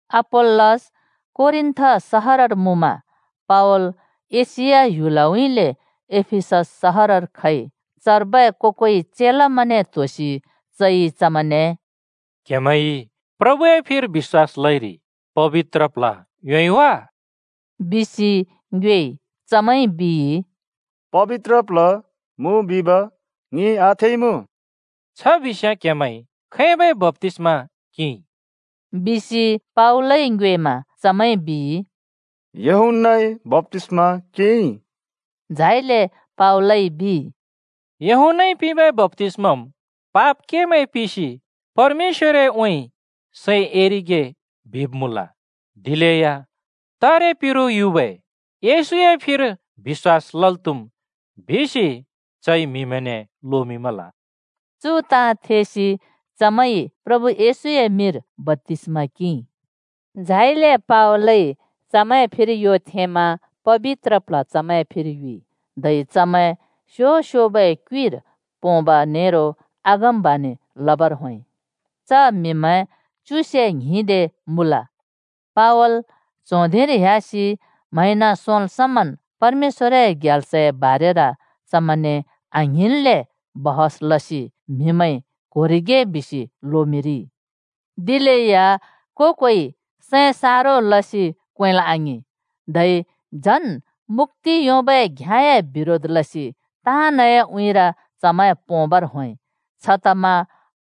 अपोल्‍लस कोरिन्‍थ सहरर मुँमा पावल एशिया ह्‍युलउँइँले एफिसस सहरर खइ। चर्बै को-कोइ चेलामैंने त्होसि चइ चमैंने “क्हेमैंइ प्रभुए फिर बिश्‍वास लइरि पबित्र प्ल्ह योंइ वा?” बिसि ङ्योएइ। चमैंइ बिइ, “पबित्र प्ल्ह मुँ बिब ङिइ आथेइमुँ।” “छ बिस्‍याँ क्हेमैंइ खैबै बप्‍तिस्मा किंइ?” बिसि पावलइ ङ्योएमा चमैंइ बिइ, “यूहन्‍नाए बप्‍तिस्मा किंइ।” झाइले पावलइ बिइ, “यूहन्‍नाइ पिंबै बप्‍तिस्माम् पाप केमैं पिसि परमेश्‍वरउँइँ सैं एरिगे बिब् मुँल। दिलेया तारे पिरु युबै येशूए फिर बिश्‍वास लल् त्हुम् बिसि चइ म्हिमैंने लोमिंमल।” चु ताँ थेसि चमैंइ प्रभु येशूए मिंर बप्‍तिस्‍मा किंइ। झाइले पावलइ चमैंए फिर यो थेंमा पबित्र प्ल्ह चमैं फिर युइ, धै चमैं स्यो-स्योबै क्युइर पोंब नेरो अगमबाणि लबर होंइ। च म्हिमैं च्युसे ङ्हिं दे मुँल। पावल च्हों धिंर ह्‍यासि म्हैंन सोंल् समन् परमेश्‍वरए ग्याल्सए बारेर चमैंने आङ्हिंन्ले छलफल लसि म्हिंमैंइ क्होरिगे बिसि लोमिंरिइ। दिलेया को-कोइ सैं सारो लसि क्वेंल् आङिं। धै झन् मुक्‍ति योंबै घ्याँए बिरोध लसि ताँनए उँइँर चमैं पोंबर होंइ। छतमा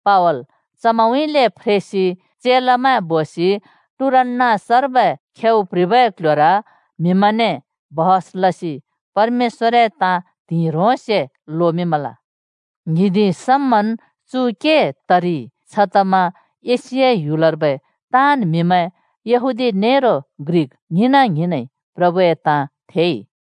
पावल चमैंउँइँले फ्रेसि चेलामैं बोसि टुरान्‍नस बिबै स्कूलर म्हिमैंने छलफल लसि परमेश्‍वरए ताँ त्हिंइ ह्रोंसे लोमिंमल। ङ्हिंदि समन् चु के तरिइ, छतमा एशिया ह्‍युलर्बै ताँन् म्हिमैं, यहूदी नेरो ग्रिक ङ्हिंना-ङ्हिंनइ, प्रभुए ताँ थेइ।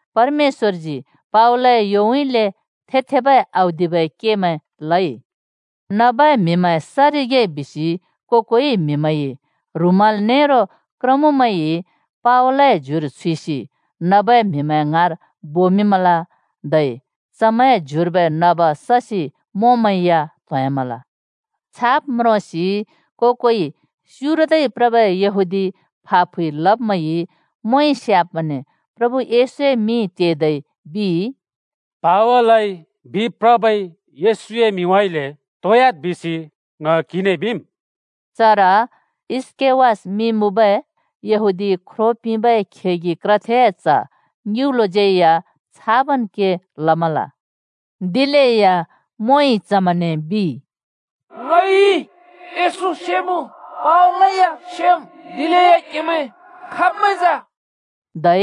परमेश्‍वरजी पावलए योउँइँले थे-थेबै औदिबै केमैं लइ। नबै म्हिमैं सरिगे बिसि को-कोइ म्हिमैंइ ह्रुमल नेरो पछ्यउरमैं या पावलए ज्युर छुइसि नबै म्हिमैं ङ्हाँर बोमिंमल, धै चमैंए ज्युर्बै नब ससि मोंमैं या त्होंह्‍यामल। छाब् म्रोंसि को-कोइ स्युरदै प्रबै यहूदी फा फुइ लब्मैंइ मोंइ स्याब्मैंने प्रभु येशूए मिं तेदै बिइ, “पावलइ बिप्रबै येशूए मिंउँइँले त्होंह्‍याद् बिसि ङ क्हिने बिम्।” चर स्‍केवास मिं मुँबै यहूदी ख्रो पिंबै खेगि क्रथेए च्ह ङिउँलोज्यै या छाबन् के लमल। दिलेया मोंइ चमैंने बिइ, “ङइ येशू सेमुँ, पावलै या सेम्, दिलेया क्हेमैं खाब्मैं जा?” धै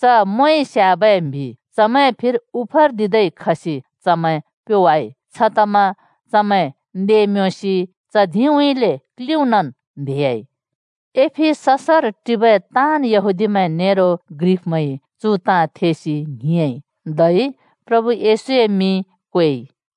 च मोंइ स्याबै म्हि चमैंए फिर उफर्दिदै ट्होवासि चमैं ताँन् प्योवाइ। छतमा चमैं नें-म्योंसि च धिंउँइँले क्लिउँनन् न्हेह्‍याइ। एफिससर टिबै ताँन् यहूदीमैं नेरो ग्रिकमैंइ चु ताँ थेसि ङ्हिंयाँइ, धै प्रभु येशूए मिं क्वेइ।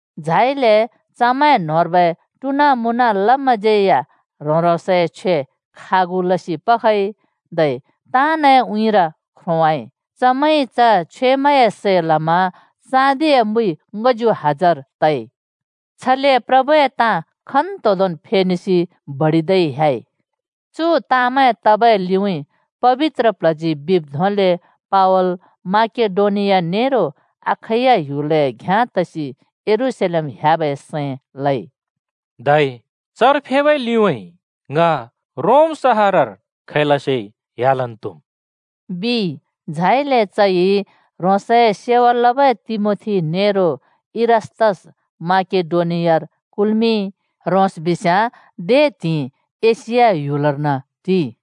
झाइले चमैंए न्होंर्बै टुना लब्मैंज्यै या ह्रों-ह्रोंसए छ्वेमैं खागु लसि पखइ, धै ताँनए उँइँर ख्रोंवाइ। चमैंइ च छ्वेमैंए सै लमा ङच्यु हजार चाँदिए सिक्‍का फेइ। छले प्रभुए ताँ खन्तोंदोंन् फेनेसि बडिदै ह्‍याइ। चु ताँमैं तबै लिउँइँ, पबित्र प्ल्हजी बिब् धोंले पावल माकेडोनिया नेरो अखैया ह्‍युलए घ्याँ तसि यरूशलेम ह्‍याबै सैं लइ। “धै चर फेबै लिउँइँ ङ रोम सहरर खैलसेया ह्‍यालन् त्हुम्,” बिइ। झाइले चइ ह्रोंसए सेवा लबै तिमोथी नेरो इरास्‍तस माकेडोनियार कुल्मिंइ, च बिस्याँ दे त्हिंइ एशिया ह्‍युलर्न टिइ।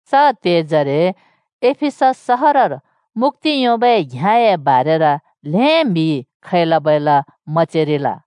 च त्हेजरे एफिसस सहरर मुक्‍ति योंबै घ्‍याँए बारेर ल्हें म्हिइ खैला-बैला मचेरिल।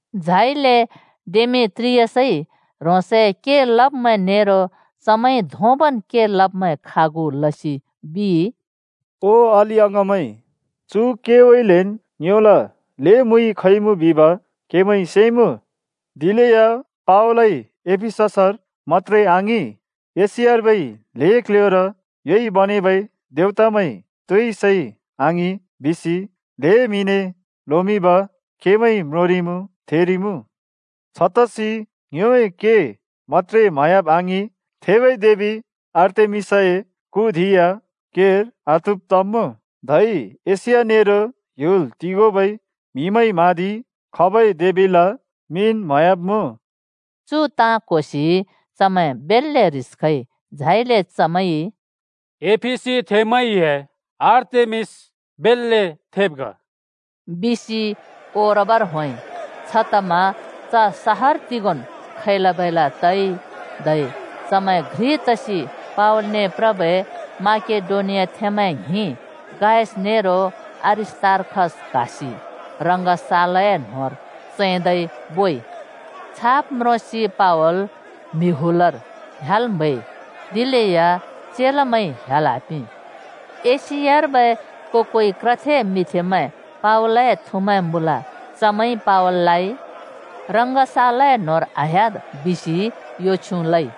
झाइले डेमेत्रियसइ ह्रोंसए के लब्मैं नेरो चमैंइ धोंबन् के लब्मैं खागु लसि बिइ, “ओ अलि-अङाँमैं, चु केउँइँलेन् ङ्योला ल्हें मुइ खइमुँ बिब क्हेमैंइ सेइमुँ। दिलेया पावलइ एफिससर मत्‍त्रे आङिं, एशियार्बै ल्हें क्ल्ह्‍योर ‘योइ बनेबै देवतामैं तोइ सैइ आङिं’ बिसि ल्हें म्हिने लोमिंब क्हेमैंइ म्रोंरिइमुँ, थेरिइमुँ। छतसि ङ्योए के मत्‍त्रे म्हयाब् आङिं, थेबै देबि आर्तेमिसए कु धिं या केर आत्हुब् तब्मुँ, धै एशिया नेरो ह्‍‍युल तिगोंबै म्हिमैंइ म्हाँदिइ खबै देबिला मिंन् म्हयाब्मुँ।” चु ताँ क्होसि चमैं बेल्‍‍ले ह्रिस खइ। झाइले चमैंइ “एफिसीथेंमैंए आर्तेमिस बेल्‍ले थेब ग!” बिसि ओरबर होंइ। छतमा च सहर तिगोंन् खैला-बैला तइ धै चमैं घ्रि तसि पावलने प्रबै माकेडोनियाथेंमैं ङ्हिं गायस नेरो अरिस्‍तार्खस क्हासि रङ्गशालए न्होंर चैंदै बोइ। छाब् म्रोंसि पावल म्हिमैं हुलर ह्‍याल् म्हैइ, दिलेया चेलामैंइ ह्‍याल् आपिं। एशियार्बै को-कोइ क्रथे मिंथेमैं पावलए थुमैं मुँल। चमैंइ पावललाइ “रङ्गशालए न्होंर आह्‍याद्!” बिसि यो छ्युँ लइ।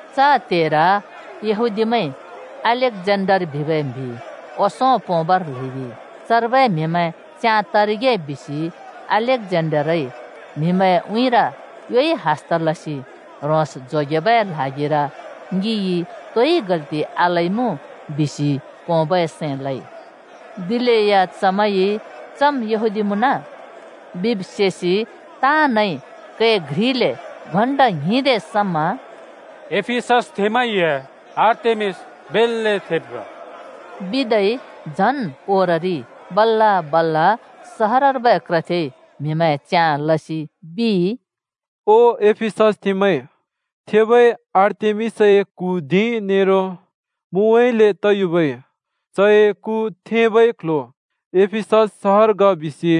च त्हेर यहूदीमैंइ अलेक्जेन्डर बिबै म्हि ओंसों पोंबर ल्हैदिइ। चर्बै म्हिमैं च्याँ तरिगे बिसि अलेक्जेन्डरइ म्हिमैंए उँइँर योइ हस्त लसि ह्रोंस बचेबै ल्हागिर “ङिइ तोइ गल्ति आलइमुँ!” बिसि पोंबै सैं लइ। दिलेया चमैंइ “चम् यहूदी मुँन” बिब् सेसि ताँनइ कै घ्रिले घण्टा ङ्हिंदे समा “एफिससथेंमैंए आर्तेमिस बेल्‍ले थेब ग!” बिदै झन् ओररिइ। बल्‍ल-बल्‍ल सहरर्बै क्रथेइ म्हिमैं च्याँ लसि बिइ, “ओ एफिससथेंमैं, थेबै आर्तेमिसए कु धिं नेरो मुउँइँले तयुबै चए कु थेंबै क्ल्ह्‍यो एफिसस सहर ग बिसि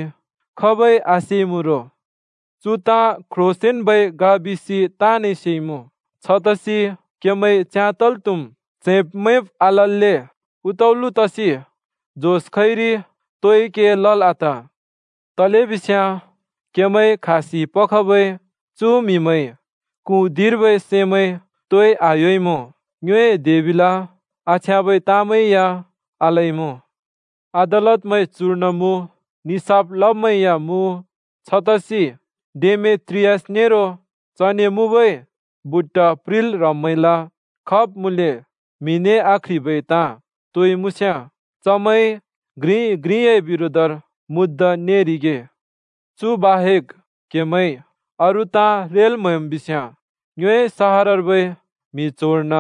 खाबइ आसेइमुँ रो? चु ताँ क्रोंसेंन्बै ग बिसि ताँनइ सेइमुँ। छतसि क्हेमैं च्याँ तल् त्हुम्। च्हैंब-मैंब् आलल्‍ले उतउलो तसि जोस खइरि तोइ के लल् आत। तलेबिस्याँ क्हेमैंइ क्हासि पखबै चु म्हिमैंइ कु धिंर्बै सैमैं तोइ आह्‍योइमुँ ङ्योए देबिला आछ्याँबै ताँमैं या आलइमुँ। अदालतमैं चुर्न मुँ, निसाफ लब्मैं या मुँ। छतसि डेमेत्रियस नेरो चने मुँबै बुट्ट प्रिंल् ह्रब्मैंला खाब् मुँले म्हिने आक्ह्रिबै ताँ तोइ मुँस्याँ चमैंइ घ्रिइ घ्रिए बिरोधर मुद्दा नेरिगे। चु बाहेक क्हेमैंइ अरू ताँ रेल् म्हैम् बिस्याँ ङ्योए सहरर्बै म्हि च्होंर्न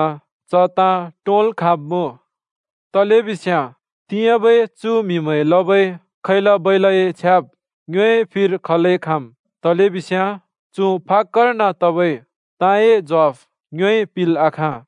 च ताँ टोंल् खाँब्मुँ। तलेबिस्याँ तिंयाँबै चु म्हिमैंइ लबै खैला-बैलाए छ्याब् ङ्योए फिर खलै खाँम्, तलेबिस्याँ चु फाक्‍कर्न तबै ताँए ज्वाफ ङ्योइ पिंल् आखाँ।”